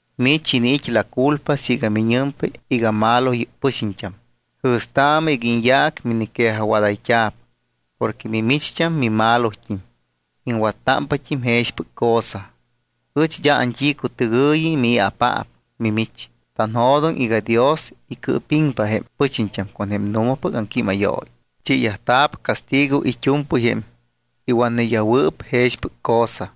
Mich iniit́ la culpa siiga miñɨmpa iga malo yɨ́p pɨxiñt́am. Jɨ̱staamɨ iga iñyaac miniquejajwadayt́a̱p porque mimicht́am mimalot́im, iŋwattámpat́im jexpɨc cosa. Ɨch d́a ant́icutɨgɨ̱yi mii̱apaap mimich. Tanjo̱doŋ iga Dios icɨɨpiŋpa jém pɨxiñt́am con jém nu̱mapɨc aŋquímayooyi. Chiiyajta̱p castigo it́u̱mpɨy jém iwatneyajwɨɨp jexpɨc cosa.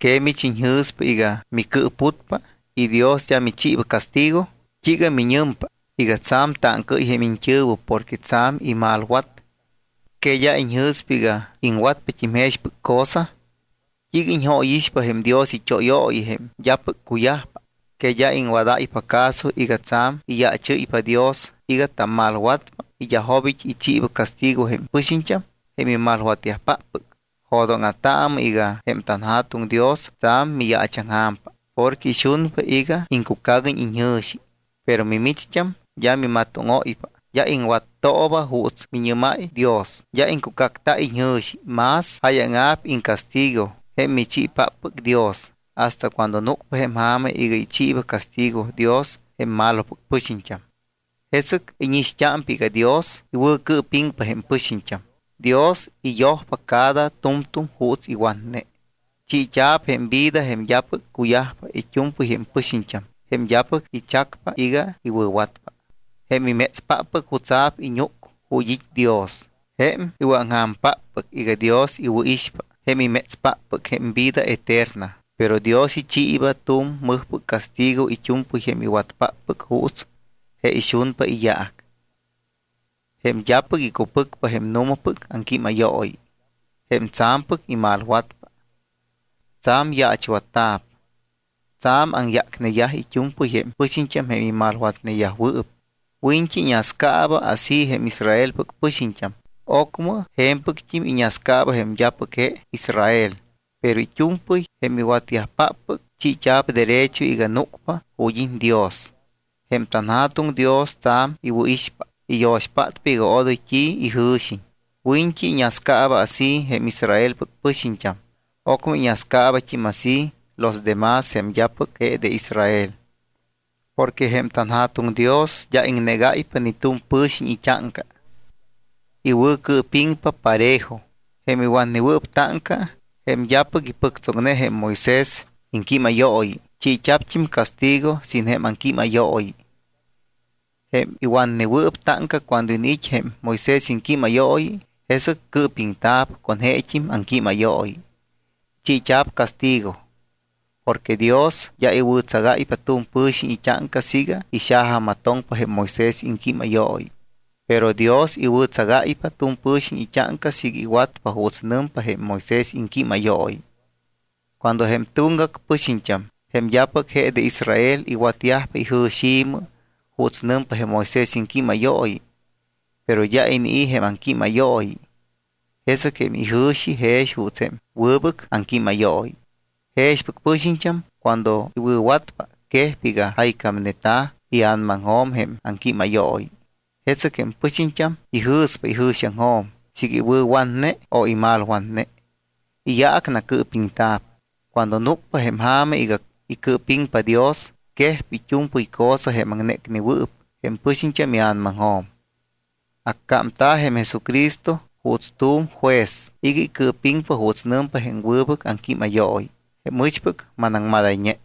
¿Que mich iñjɨ̱spa iga micɨɨputpa y Dios d́a michiiba castigo? ¿T́iiga miñɨmpa iga tsa̱m táŋcaɨ́y jém iñt́ɨ̱wɨ porque tsa̱m imalwat? ¿Que d́a iñjɨ̱spa iga iŋwatpat́im jexpɨc cosa? ¿T́iiga iñjóyixpa jém Dios it́óyooyi jém d́apɨc cuyajpa? ¿Que d́a iŋwadáypa caso iga tsa̱m iyaachɨ́ypa Dios iga tammalwatpa y d́a jobit́ ichiiba castigo jém pɨxiñt́am jém imalwatyajpáppɨc? Jo̱dóŋa̱taamɨ iga jém tanJa̱tuŋ Dios tsa̱m miyaachaŋja̱mpa porque ixunpa iga iŋcucaguiñ iñjɨ̱xi. Pero micht́am d́a mimatóŋóypa, d́a iŋwattooba juuts miñɨ́máy Dios, d́a iŋcucacta iñjɨ̱xi. Más jáyaŋa̱p iŋcastigo jém michiipáppɨc Dios hasta cuando núcpa jém ja̱ma iga ichiiba castigo Dios jém malopɨc pɨxiñt́am. Jesɨc íñixt́ámpa iga Dios iwɨ̱cɨɨpiŋpa jém pɨxiñt́am. Dios icyojpa cada tu̱mtu̱m juuts iwatne. Chiit́a̱p jém vida jém d́apɨc cuyajpa it́u̱mpɨy jém pɨxiñt́am jém d́apɨc ichacpa iga iwɨ̱watpa, jém imétspáppɨc jutsa̱p iñúc ju̱t́ it́ Dios, jém iwɨ̱aŋja̱mpáppɨc iga Dios iwɨ̱ixpa, jém imétspáppɨc jém vida eterna. Pero Dios ichiiba tu̱m mɨjpɨc castigo it́u̱mpɨy jém iwatpáppɨc juuts je ixunpa iyaac, jém d́apɨc icupɨcpa jém nu̱mapɨc aŋquímayooyi, jém tsa̱mpɨc imalwatpa. Tsa̱m yaachwatyajta̱p, tsa̱m aŋyácneyaj it́u̱mpɨy jém pɨxiñt́am jém imalwatneyajwɨɨp. Wiñt́i iñascaaba así jém Israelpɨc pɨxiñt́am, ocmɨ je̱mpɨct́im iñascaaba jém d́apɨc je de Israel. Pero it́u̱mpɨy jém iwɨ̱watyajpáppɨc, chiit́a̱p derecho iga núcpa ju̱t́ it́ Dios. Jém tanJa̱tuŋ Dios tsa̱m iwɨ̱ixpa, iyo̱xpátpa iga odoy t́i ijɨ̱xiñ. Wiñt́i iñascaaba así jém Israelpɨc pɨxiñt́am, ocmɨ iñascaabat́im así los demás, jém d́apɨc je de Israel. Porque jém tanJa̱tuŋ Dios d́a iŋnégáypa ni tu̱m pɨ̱xiñ it́áŋca, iwɨ̱cɨɨpiŋpa parejo. Jém iwatnewɨɨp táŋca, jém d́apɨc ipɨctsoŋne jém Moisés iŋquímayooyi, chiit́a̱pt́im castigo sin jém aŋquímayooyi. Jém iwatnewɨɨp táŋca cuando iniit́ jém Moisés iŋquímayooyi, jesɨc cɨɨpiŋta̱p con jeet́im aŋquímayooyi. Chiit́a̱p castigo. Porque Dios d́a iwɨ̱tsagáypa tu̱m pɨ̱xiñ it́áŋca siiga ixajamatoŋpa jém Moisés iŋquímayooyi. Pero Dios iwɨ̱tsagáypa tu̱m pɨ̱xiñ it́áŋca siiga iwatpa juuts nɨmpa jém Moisés iŋquímayooyi. Cuando jém tuŋgac pɨxiñt́am, jém d́apɨc je de Israel, iwatyajpa ijɨ̱xi̱mɨ juuts nɨmpa jém Moisés iŋquímayooyi, pero d́a inii̱ jém aŋquímayooyi, jesɨc jém ijɨ̱xi jex juuts jém wɨbɨc aŋquímayooyi. Jexpɨc pɨxiñt́am cuando iwɨ̱watpa, quejpa iga jaycámneta̱ ia̱namaŋjo̱m jém aŋquímayooyi. Jesɨc jém pɨxiñt́am ijɨ̱spa ijɨ̱xiaŋjo̱m siiga iwɨ̱watne o imalwatne. Iyaac nacɨɨpiŋta̱p. Cuando núcpa jém ja̱ma iga icɨɨpiŋpa Dios, quejpa it́u̱mpɨy cosa jém aŋnécnewɨɨp jém pɨxiñt́am ia̱namaŋjo̱m. Accámta̱ jém Jesucristo juuts tu̱m juez iga icɨɨpiŋpa juuts nɨmpa jém wɨbɨc aŋquímayooyi, jém ɨchpɨc manaŋmadayñe.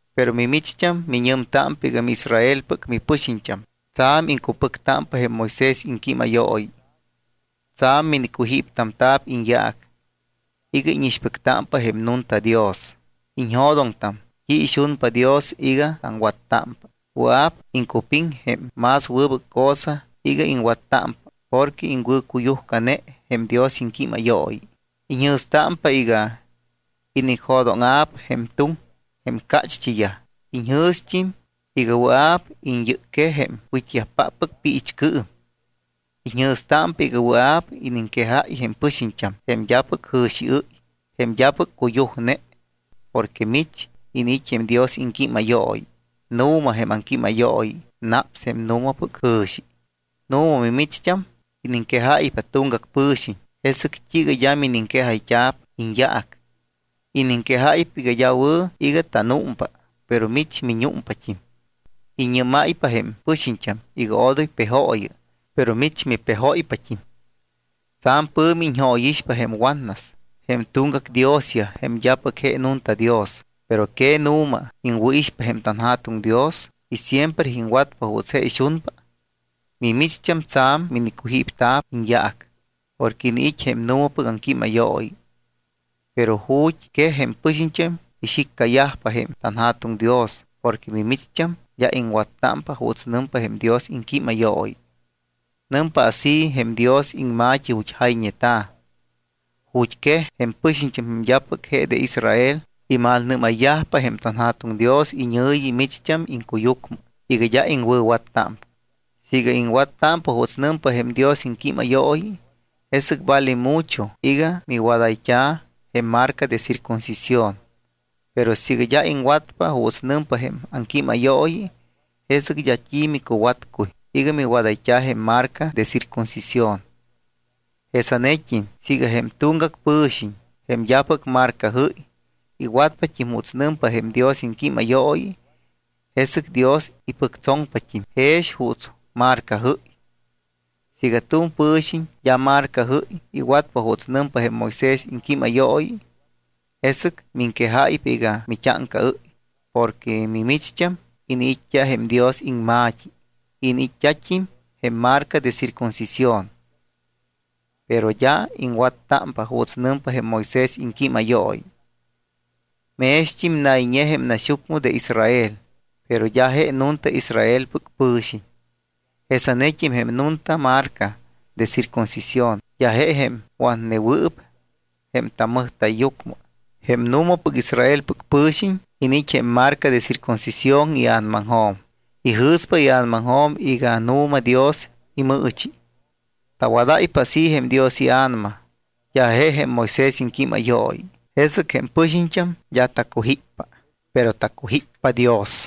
Pero mimicht́am miñɨmtámpa iga miIsraelpɨc mipɨxiñt́am. Tsa̱m iŋcupɨctámpa jém Moisés iŋquímayooyi. Tsa̱m minicujíptamta̱p iñyaac iga íñixpɨctámpa jém nunta Dios. Iñjo̱doŋtam t́i ixunpa Dios iga taŋwattámpa. Wɨa̱p iŋcupiŋ jém más wɨbɨc cosa iga iŋwattámpa porque iŋwɨ̱cuyujcane jém Dios iŋquímayooyi. Iñjɨ̱stámpa iga inicjo̱dóŋa̱p jém tuŋ jém cácht́iyaj. Iñjɨ̱st́im iga wɨa̱p iñyɨcquej jém wit́yajpáppɨc piichcɨɨm. Iñjɨ̱stámpa iga wɨa̱p iniŋquejáy jém pɨxiñt́am, jém d́apɨc jɨ̱xiɨ́y, jém d́apɨc cuyujne, porque mich iniit́ jém Dios iŋquímayooyi. Nu̱ma jém aŋquímayooyi naps jém nu̱mapɨc jɨ̱xi. Nu̱ma, mimicht́am, iniŋquejáypa tuŋgac pɨ̱xiñ, ¿jesɨc t́iiga d́a miniŋquejayt́a̱p iñyaac? Iniŋquejáypa iga d́a wɨ̱ iga tanúmpa, pero mich miñúmpat́im. Iññɨ́máypa jém pɨxiñt́am iga odoy pejooyɨ, pero mich mipejóypat́im. Tsa̱m pɨ̱mi iñjóyixpa jém watnas jém tuŋgac diosyaj, jém d́apɨc je nunta Dios, ¿pero que nu̱ma iŋwɨ̱ixpa jém tanJa̱tuŋ Dios y siempre iŋwatpa juuts je ixunpa? Mimicht́am tsa̱m minicujípta̱p iñyaac porque iniit́ jém nu̱mapɨc aŋquímayooyi. Pero ju̱t́ quej jém pɨxiñt́am ixiccayajpa jém tanJa̱tuŋ Dios porque mimicht́am d́a iŋwattámpa juuts nɨmpa jém Dios iŋquímayooyi. Nɨmpa así jém Dios iŋma̱t́i ju̱t́ jayñeta̱: “Ju̱t́quej jém pɨxiñt́am, jém d́apɨc je de Israel, imalnɨ́mayyajpa jém tanJa̱tuŋ Dios iñɨ̱yi micht́am iŋcuyucmɨ iga d́a iŋwɨ̱wattámpa.” Siiga iŋwattámpa juuts nɨmpa jém Dios iŋquímayooyi, jesɨc vale mucho iga miwadayt́a̱ jém marca de circuncisión. Pero siiga d́a iŋwatpa juuts nɨmpa jém aŋquímayooyi, jesɨc d́a t́i micuwatcuy iga miwadayt́a̱ jém marca de circuncisión. Jesanet́im siiga jém tuŋgac pɨ̱xiñ, jém d́apɨc marcajɨ́y, iwatpat́im juuts nɨmpa jém Dios iŋquímayooyi, jesɨc Dios ipɨctsoŋpat́im jext́im juuts marcajɨ́y. Siiga tu̱m pɨ̱xiñ d́a marcajɨ́y iwatpa juuts nɨmpa jém Moisés iŋquímayooyi, jesɨc miŋquejáypa iga mit́áŋcaɨ́y porque mimicht́am iniit́t́a jém Dios iŋma̱t́i y iniit́t́at́im jém marca de circuncisión, pero d́a iŋwattámpa juuts nɨmpa jém Moisés iŋquímayooyi. Mext́im nayñe jém naxyucmɨ de Israel, pero d́a je nunta Israelpɨc pɨ̱xiñ. Jesanet́im jém nunta marca de circuncisión d́a je jém watnewɨɨp jém tammɨjta̱yyucmɨ. Jém nu̱mapɨc Israelpɨc pɨ̱xiñ iniit́ jém marca de circuncisión ia̱namaŋjo̱m. Ijɨ̱spa ia̱namaŋjo̱m iga nu̱ma Dios imɨɨchi. Tawadáypa así jém Dios iA̱nama, d́a je jém Moisés iŋquímayooyi. Jesɨc jém pɨxiñt́am d́a tacujíppa, pero tacujíppa Dios.